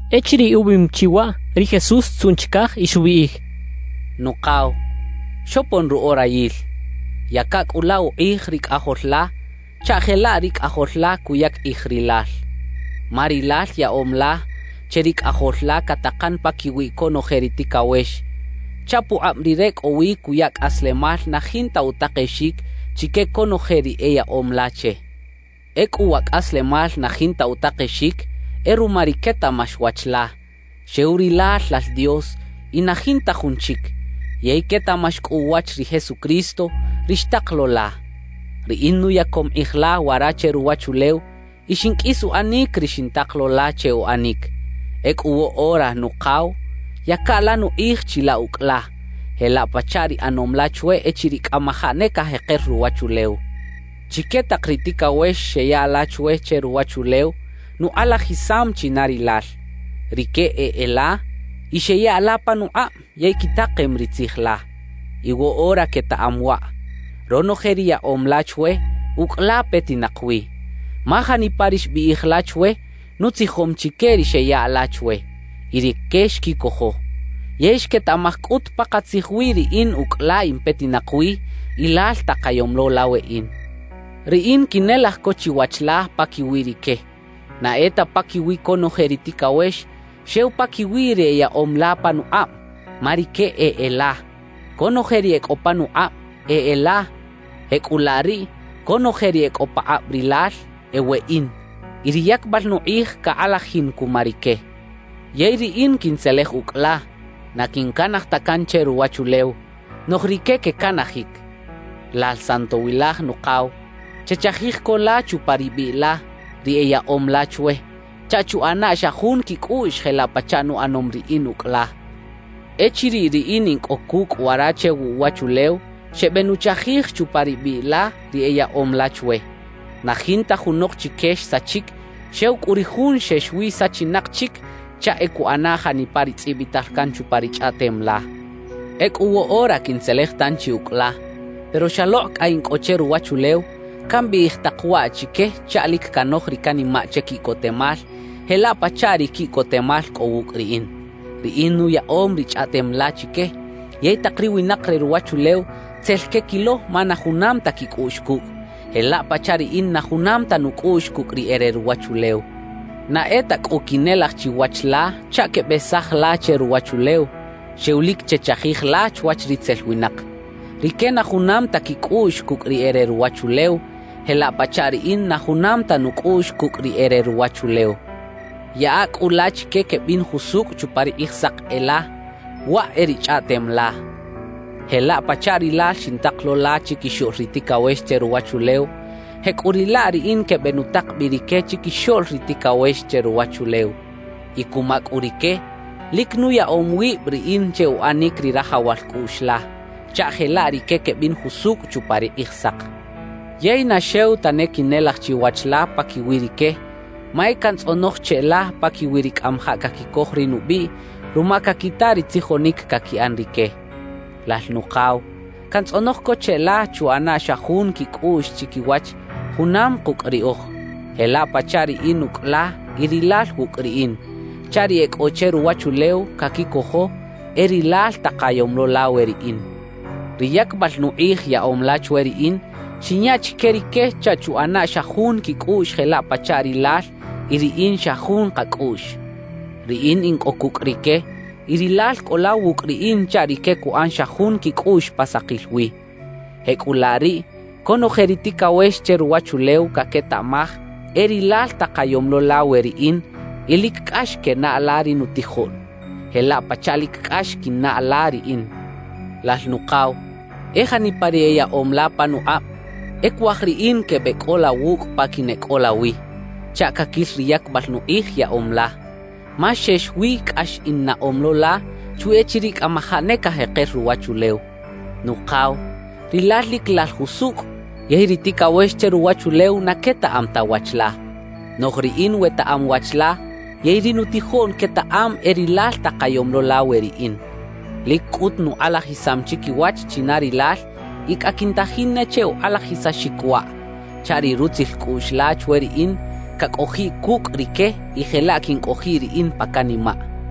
Echiriꞌ ubiꞌim chi waꞌ, ri Jesús xtzuꞌn chicaj y xubiꞌij: «Nukaw, xopon ru orayil; yaca cꞌu la ukꞌij ri Cꞌajol la chaꞌ jelaꞌ ri Cꞌajol la cuyac kꞌij Rilal. Ma Rilal yaꞌom la che ri Cꞌajol la catakan paquiwi conoje ri ticawex, chaꞌ pukꞌab Rire cꞌo wi cuya cꞌaslemal na jinta utakexic chique conoje ri eyaꞌom la che. Ecꞌu wa cꞌaslemal na jinta utakexic e ruma ri quetaꞌmax wach la, xew Rilal Lal Dios y na jinta jun chic, yey quetaꞌmax cꞌu uwach ri Jesucristo, ri xtak lo la. »Riꞌin nuyacom kꞌij la wara che ruwachulew y xinqꞌuis uꞌanic ri xintak lo la che uꞌanic. Ecꞌu woꞌora Nukaw, yaca la nukꞌij chilaꞌ ucꞌ la, jelaꞌ pachaꞌ ri ꞌanom la chwe echiriꞌ cꞌamajaꞌ ne cajeker ruwachulew. »Chique tak ri ticawex xeya la chwe che ruwachulew, nukꞌalajisam china Rilal. Rique e e la, y xeya la panukꞌab yey quitakem ri tzij la. Y woꞌora quetaꞌam waꞌ: Ronoje ri yaꞌom la chwe, ucꞌ la petinak wi. Ma janipa ri xbiꞌij la chwe, nutzijom chique ri xeya la chwe, y rique xquicojo. Yey xquetaꞌmaj cꞌut pakatzij wi riꞌin ucꞌ la in petinak wi y Lal takayom lo la weꞌin. »Riꞌin quinelaj co chiwach la paquiwi rique; na e ta paquiwi conoje ri ticawex, xew paquiwi ri eyaꞌom la panukꞌab, ma rique e e la. Conoje ri e cꞌo panukꞌab, e e la. Jecꞌulaꞌ riꞌ, conoje ri e cꞌo pakꞌab Rilal, e weꞌin. Y ri yacbal nukꞌij cakꞌalajin cuma rique. »Yey riꞌin quintzelej ucꞌ la, na quincanaj ta can che ruwachulew; noꞌj rique quecanajic. Lal Santowilaj Nukaw, chechajij co la chupa ri biꞌ la, ri eyaꞌom la chwe, chaꞌ chuꞌana xa jun quicꞌuꞌx jelaꞌ pachaꞌ nuꞌanom riꞌin ucꞌ la. Echiriꞌ riꞌin in cꞌo cucꞌ wara che wuꞌwachulew, xebenuchajij chupa ri biꞌ la ri eyaꞌom la chwe. Na jinta junok chique xsachic, xew cꞌu ri jun xex wi sachinak chic chaꞌ e cuꞌana janipa ri tzꞌibital can chupa ri Chꞌaꞌtem la. »Ecꞌu woꞌora quintzelej tanchi ucꞌ la. Pero xalokꞌ cꞌa in cꞌo che ruwachulew, cambiꞌij tak waꞌ chique chaꞌ lic canoj ri canimaꞌ che quiꞌcotemal, jelaꞌ pachaꞌ ri quiꞌcotemal cꞌo wucꞌ riꞌin. »Riꞌin nuyaꞌom ri Chꞌaꞌtem la chique. Yey tak ri winak re ruwachulew tzel quequilo ma na junam ta quicꞌuꞌx cucꞌ, jelaꞌ pachaꞌ riꞌin na junam ta nucꞌuꞌx cucꞌ ri e re ruwachulew. Na e ta cꞌu quinelaj chiwach la chaꞌ quebesaj la che ruwachulew, xew lic chechajij la chwach ritzel winak. Rique na junam ta quicꞌuꞌx cucꞌ ri e re ruwachulew, jelaꞌ pachaꞌ riꞌin na junam ta nucꞌuꞌx cucꞌ ri e re ruwachulew. »Yaꞌa cꞌu la chique quebin jusucꞌ chupa ri Kꞌijsak e la, waꞌ e ri Chꞌaꞌtem la. Jelaꞌ pachaꞌ Rilal xintak lo la chiquixoꞌl ri ticawex che ruwachulew, jecꞌuriꞌlaꞌ riꞌin quebenutak bi rique chiquixoꞌl ri ticawex che ruwachulew. Y cuma cꞌu rique, lic nuyaꞌom wib riꞌin che uꞌanic ri rajawal cꞌuꞌx la, chaꞌ jelaꞌ rique quebin jusucꞌ chupa ri Kꞌijsak. »Yey na xew tane quinelaj chiwach la paquiwi rique, ma e cantzꞌonoj cheꞌla paquiwi ri cꞌamajaꞌ caquicoj ri nubiꞌ ruma caquita ri tzijonic caquiꞌan rique. Lal Nukaw, cantzꞌonoj co cheꞌla chuꞌana xa jun quicꞌuꞌx chiquiwach junam kucꞌ riꞌoj, jelaꞌ pachaꞌ riꞌin ucꞌ la y Rilal wucꞌ riꞌin, chaꞌ ri e cꞌo che ruwachulew caquicojo e rilal takayom lo la we riꞌin. »Ri yacbal nukꞌij yaꞌom la chwe riꞌin, xinya chique rique chaꞌ chuꞌana xa jun quicꞌuꞌx jelaꞌ pachaꞌ Rilal y riꞌin xa jun kacꞌuꞌx. Riꞌin in cꞌo cucꞌ rique y Rilal cꞌo la wucꞌ riꞌin chaꞌ rique cuꞌan xa jun quicꞌuꞌx pa sakil wi. Jecꞌulaꞌ riꞌ conoje ri ticawex che ruwachulew caquetaꞌmaj e Rilal takayom lo la we riꞌin y lic cꞌax quenaꞌ la ri nutijoꞌn, jelaꞌ pachaꞌ lic cꞌax quinnaꞌ la riꞌin. »Lal Nukaw, e janipa ri eyaꞌom la panukꞌab, e cuaj riꞌin quebeꞌcꞌola wucꞌ pa quineꞌcꞌola wi, chaꞌ caquil ri yacbal nukꞌij yaꞌom la. Ma xex wi cꞌax innaꞌom lo la, chwi echiriꞌ cꞌamajaꞌ ne cajeker ruwachulew. Nukaw, Rilal lic Lal jusucꞌ, yey ri ticawex che ruwachulew na quetaꞌam ta wach la. Noꞌj riꞌin wetaꞌam wach la yey ri nutijoꞌn quetaꞌam e Rilal takayom lo la we riꞌin. Lic cꞌut nukꞌalajisam chiquiwach china Rilal y cꞌa quintajin ne che ukꞌalajisaxic waꞌ, chaꞌ ri rutzil cꞌuꞌx la chwe riꞌin, cacꞌojiꞌ cucꞌ rique y jelaꞌ quincꞌojiꞌ riꞌin pa canimaꞌ» xchaꞌ.